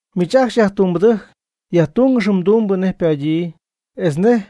Miich ajcxy yajtumbɨdɨjc, yajtungɨx mdumbɨ nej ypadyii etz nej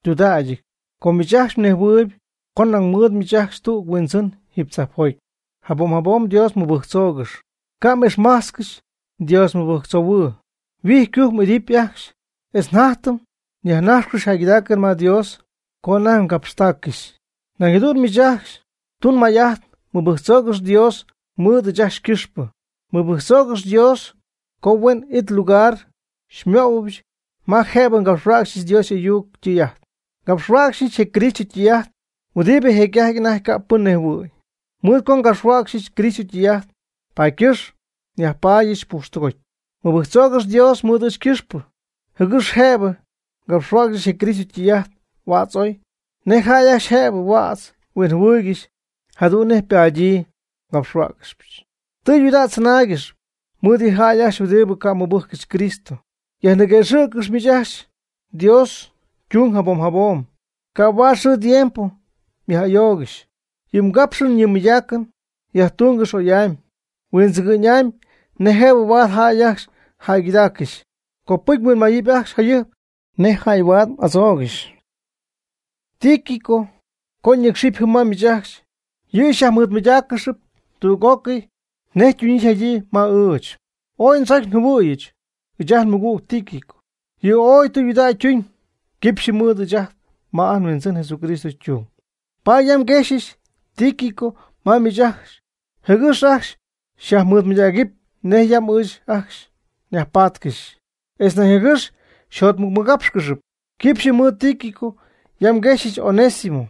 ytudägyɨty, com miich ajcxy mnejhuɨɨyb co nañ mɨɨd miich ajcxy tüg mHuindzɨn jiiby tzajpjoty. Jabom jabom Dios mɨbɨjctzoogɨx, ca' m'ixmajtzcɨxy Dios mɨbɨjctzoohuɨn. Huijy ycujc m'idɨpy ajcxy etz jatytɨm yajnajxcɨxy jäygɨdaacɨn ma Dios co anajty mgapxtaaccɨxy. Nañ jadu'n miich ajcxy tun may'ajt mɨbɨjctzoogɨx Dios mɨɨd ɨɨch ajcxy ycɨxpɨ. Mɨbɨjctzoogɨx Dios co huen it lugar xymöhuɨbyɨch ma jëbɨ ngapxhuäcxyɨch Dios y'ayuc ytɨy'ajt. Ngapxhuäcxyñɨch je Cristo ytɨy'ajt huɨdibɨ jecy'ajty anajty ca' pɨn nejhuɨ̈y. Mɨɨd co ngapxhuäcxɨch Cristo ytɨy'ajt, paady ycɨxp nyajpaadyɨch pujxtɨgoty. Mɨbɨjctzoogɨx Dios mɨɨd ɨɨch ycɨxpɨ, jɨgɨx jëbɨ ngapxhuäcxyɨch je Cristo ytɨy'ajt huädz oy, nej jäy ajcxy jëb huädz huinjɨhuɨɨygɨxy, jadu'n nej ypadyii ngapxhuäcxɨbyɨch. Tɨydudägy mdzɨnáaygɨxɨpy mɨɨd yɨ jäy ajcxy huɨdibɨ ca' mɨbɨjccɨxy Cristo. Yajniguëxɨ̈ccɨx miich ajcxy Dios ytung jabom jabom, ca' huaad xɨɨ tiempo myaj'ayoogɨxy. Yɨ mgapxɨn yɨ mmɨydaacɨn yajtungɨx oy'amy huindzɨgɨ'ñ'amy nej jëbɨ huaad jäy ajcxy jäygɨdaaccɨxy. Copɨcy mhuinmayɨpy ajcxy jayɨjp nej jäy huaad m'adzoogɨxy. Tíquico co ñɨcxɨpy jɨm ma miich ajcxy, yɨ' xyyajmɨɨdmɨydáaccɨxɨpy tüg'ócɨy nej ytunyii yjadyii ma ɨɨch. Ooy ndzocy njɨhuɨ̈yɨch ɨɨch ajt nmɨgüg Tíquico. Yɨ' ooy tudägy ytuuñ quipxyɨ mɨɨd ɨɨch ajcxy ma ajt nHuindzɨn Jesucristo ytung. Paady yam nguexyɨch Tíquico ma miich ajcxy jɨgɨx ajcxy xyajmɨɨdmɨydägɨpy nej yam ɨɨch ajcxy nyajpaatcɨxy, etz nañ jɨgɨx xyjotmɨcmɨgápxcɨxɨpy. Quipxyɨ mɨɨd Tíquico yam nguexyɨch Onésimo,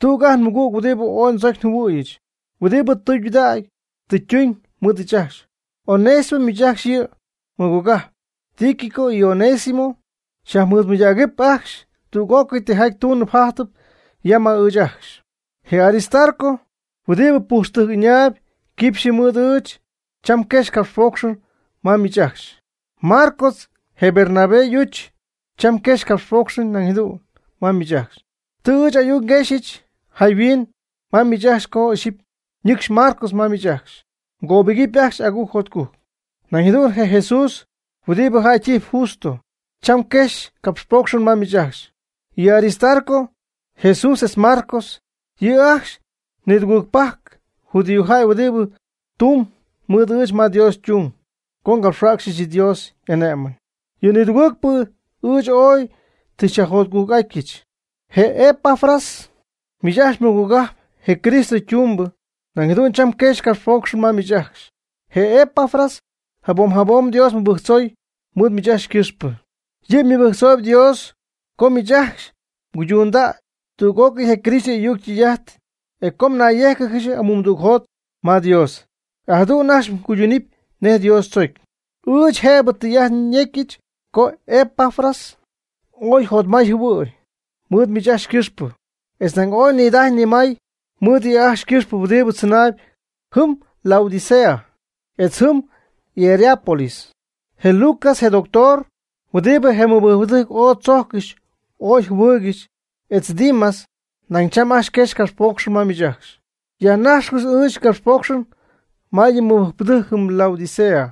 tüg ajt nmɨgüg huɨdibɨ ooy ndzocy njɨhuɨ̈yɨch, huɨdibɨ tudägy tɨ ytuuñ mɨɨd ɨɨch ajcxy. Onésimo miich ajcxy yɨ mmɨgogajp. Tíquico y Onésimo xyajmɨɨdmɨydägɨp ajcxy tüg'ócɨy tijaty tuunɨp jajtɨp yam ma ɨɨch ajcxy. Je Aristarco, huɨdibɨ pujxtɨjc ɨñaayb quipxyɨ mɨɨd ɨɨch, cham quexy capxpoocxɨn ma miich ajcxy. Marcos, je Bernabé y'uch, cham quexy capxpoocxɨn nañ jadu'n ma miich ajcxy. Tɨ ɨɨch ayuc nguexyɨch jayhuin ma miich ajcxy co ixyipy ñɨcxy Marcos ma miich ajcxy, mgöbɨgɨpy ajcxy agujc jotcujc. Nañ jadu'n je Jesús huɨdibɨ jäy ytijpy Justo, cham quexy capxpoocxɨn ma miich ajcxy. Yɨ Aristarco, Jesús etz Marcos yɨ' ajcxy ni tugɨɨgpajc, judíojäy huɨdibɨ tumb mɨɨd ɨɨch ma Dios ytung co ngapxhuäcxyɨch Dios y'ane'mɨn. Yɨ nidugɨɨgpɨ ɨɨch ooy tɨ xyajjotcujc'atyɨch. Je Epafras, miich ajcxy mmɨgogajp je Cristo ytumbɨ, nañ jadu'n cham quexy capxpoocxɨn ma miich ajcxy. Je Epafras jabom jabom Dios mɨbɨjctzoy mɨɨd miich ajcxy ycɨxpɨ. Yɨ' mɨbɨjctzoob Dios co miich ajcxy cuydunda' tüg'ócɨy je Cristo y'ayuc ytɨy'ajt, etz co nayyéjcɨgɨx amumdügjot ma Dios, e jadu'n ajcxy mguydunɨpy nej Dios tzocy. Ɨɨch jëbɨ tɨy'ajt nyecyɨch co Epafras ooy jotmay jɨhuɨ̈y mɨɨd miich ajcxy ycɨxpɨ, etz nañ ooy nidajy nimay mɨɨd yɨ' ajcxy ycɨxpɨ huɨdibɨ tzɨnaayb jɨm Laodicea etz jɨm Hierápolis. Je Lucas, je doctor, huɨdibɨ je mɨbɨjcpɨdɨjc ooy tzojccɨxy ooy jɨhuɨɨygɨxy etz Dimas nañ cham ajcxy quexy capxpoocxɨn ma miich ajcxy. Yajnajxcɨx ɨɨch ngapxpoocxɨn ma yɨ mɨbɨjcpɨdɨjc jɨm Laodicea.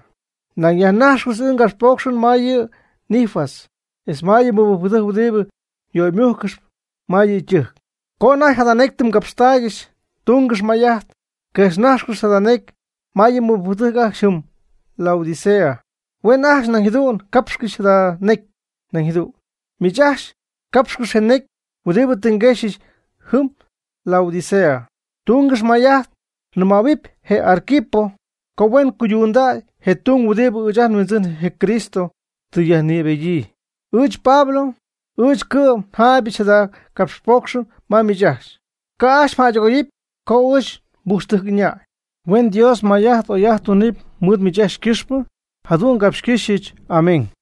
Nañ yajnajxcɨx ɨɨch ngapxpoocxɨn ma yɨ Ninfas etz ma yɨ mɨbɨjcpɨdɨjc huɨdibɨ yöymujccɨxp ma yɨ' ytɨjc. Co anajty jada necy tɨ mgapxtaaygɨxy, tungɨx may'ajt quejxnajxcɨx jada necy ma yɨ mɨbɨjcpɨdɨjc ajcxy jɨm Laodicea. Huen ajcxy nañ jadu'n capxcɨxy jada necy, nañ jadu'n miich ajcxy capxcɨx je necy huɨdibɨ tɨ nquexyɨch jɨm Laodicea. Tungɨx may'ajt mnɨmähuɨpy je Arquipo co huen cuydundäy je tung huɨdibɨ ɨɨch ajt nHuindzɨn je Cristo tɨ yajnïbedyii. Ɨɨch Pablo, ɨɨch cɨ'm njaaybɨch jada capxpoocxɨn ma miich ajcxy. Ca' ajcxy mjäydɨgoyɨpy co ɨɨch nbujxtɨjc ɨñäy. Huen Dios may'ajt oy'ajt tunɨpy mɨɨd miich ajcxy ycɨxpɨ. Jadu'n ngapxcɨ́xyɨch. Amén.